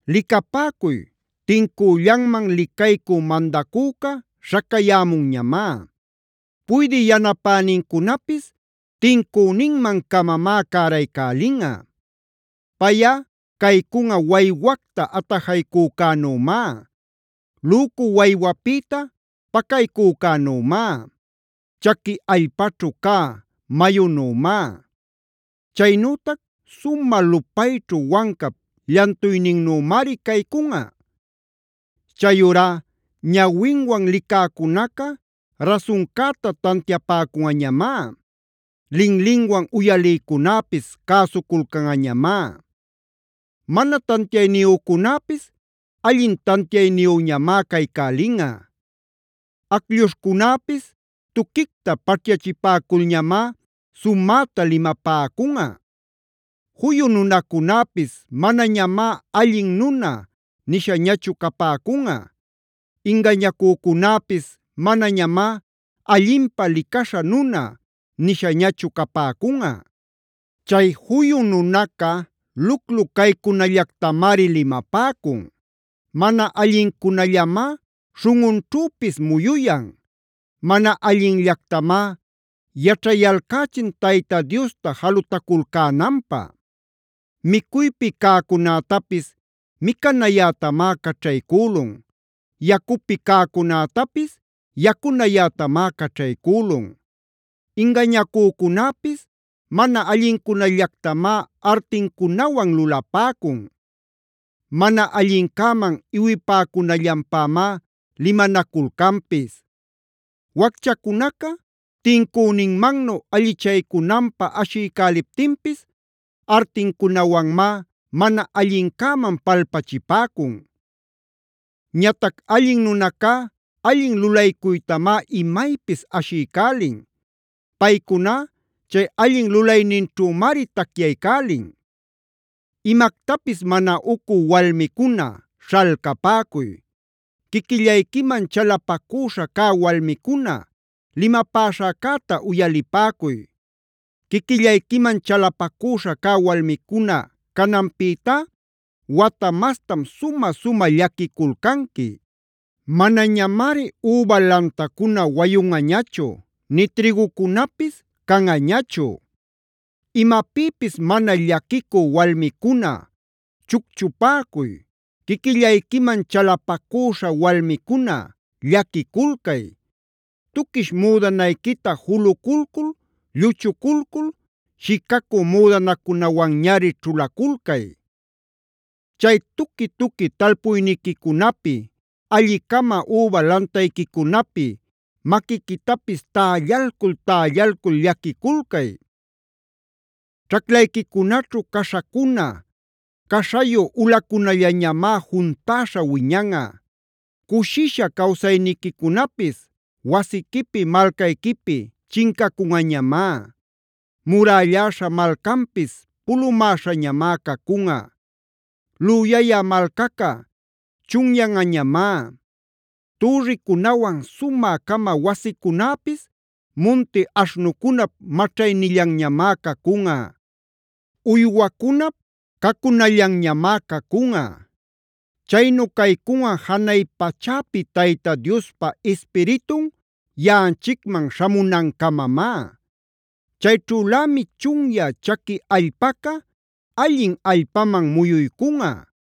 ¡Licapäcuy, tincüllanman licaycü mandacüca śhacayämunñamá! Puydï yanapänincunapis tincüninman-camamá cäraycälinꞌa. Payꞌa caycunꞌa waywacta atajaycücänümá; lücu waywapïta pacaycücänümá; chaqui allpaćhu cä mayunümá. Chaynütac sumä lupayćhu wancap llantuyninnümari caycunꞌa. Chayurá ñawinwan licäcunaca rasuncäta tantiapäcunꞌañamá. Linlinwan uyalïcunäpis cäsuculcanꞌañamá. Mana tantiayniyücunäpis allin tantiayniyüñamá caycälinꞌa. Aclluśhcunäpis tuquicta paćhyachipäculñamá sumäta limapäcunꞌa. Juyu nunacunäpis manañamá “allin nuna” nishañachu capäcunꞌa. Ingañacücunäpis manañamá “allinpä licaśha nuna” nishañachu capäcunꞌa. Chay juyu nunaca luclu caycunallactamari limapäcun. Mana allincunallamá śhunꞌunćhüpis muyuyan; mana allinllactamá yaćhayalcächin Tayta Diosta jalutaculcänanpä. Micuypi cäcunätapis micanayätamá caćhaycülun; yacupi cäcunätapis yacunayätamá caćhaycülun. Ingañacücunäpis mana allincunallactamá artincunawan lulapäcun. Mana allincäman iwipäcunallanpämá limanaculcanpis. Wacchacunaca tincüninmannu allichaycunanpä ashiycäliptinpis, artincunawanmá mana allincäman palpachipäcun. Ñatac allin nunacá allin lulaycuytamá imaypis ashiycälin; paycuná chay allin lulayninćhümari tacyaycälin. ¡Imactapis mana ucü walmicuna śhalcapäcuy! ¡Quiquillayquiman chalapacüśha cä walmicuna limapäśhäcäta uyalipäcuy! Quiquillayquiman chalapacüśha cä walmicuna cananpïta, wata mastam sumä-sumä llaquiculcanqui. Manañamari üba lantacuna wayunꞌañachu nï trïgucunapis canꞌañachu. Imapïpis mana llaquicü walmicuna chucchupäcuy; quiquillayquiman chalapacüśha walmicuna llaquiculcay. Tuquish müdanayquita juluculcul, lluchuculcul, shicacü müdanacunawanñari ćhulaculcay. Chay tuqui-tuqui talpuyniquicunapi, alli-cama üba lantayquicunapi maquiquitapis tällalcul-tällalcul llaquiculcay. Ćhaclayquicunaćhu caśhacuna, caśhayu ulacunallañamá juntäśha wiñanꞌa. Cushisha cawsayniquicunapis wasiquipi, malcayquipi chincacunꞌañamá. Murälläśha malcanpis pulumäśhañamá cacunꞌa; lüyayä malcaca chunyanꞌañamá. Türricunawan sumä-cama wasicunäpis munti aśhnucunap maćhaynillanñamá cacunꞌa, uywacunap cacunallanñamá cacunꞌa. Chaynu caycunꞌa janay pachäpi Tayta Diospa Ispiritun yaꞌanchicman śhamunancamamá. Chayćhülämi chunyä chaqui allpaca allin allpaman muyuycunꞌa;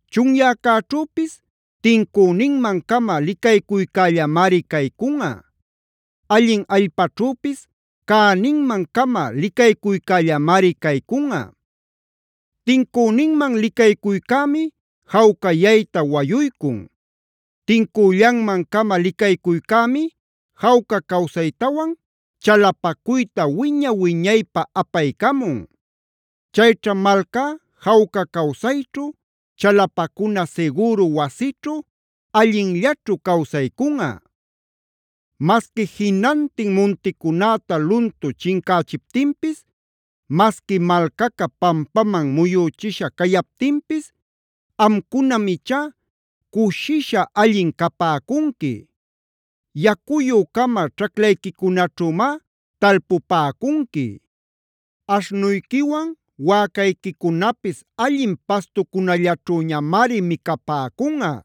Chunyäcäćhüpis tincüninman-cama licaycuycällamari caycunꞌa. Allin allpaćhüpis cäninman-cama licaycuycällamari caycunꞌa. Tincüninman licaycuycämi jawcayayta wayuycun. Tincüllanman-cama licaycuycämi jawca cawsaytawan chalapacuyta wiña-wiñaypä apaycamun. Chayćha malcá jawca cawsayćhu, chalapacuna sigüru wasićhu allinllaćhu cawsaycunꞌa. Masqui jinantin munticunäta luntu chincächiptinpis, masqui malcaca pampaman muyüchisha cayaptinpis, amcunam ichá cushisha allin capäcunqui. Yacuyü-cama ćhaclayquicunaćhümá talpupäcunqui. Aśhnuyquiwan wäcayquicunapis allin pastucunallaćhüñamari micapäcunꞌa.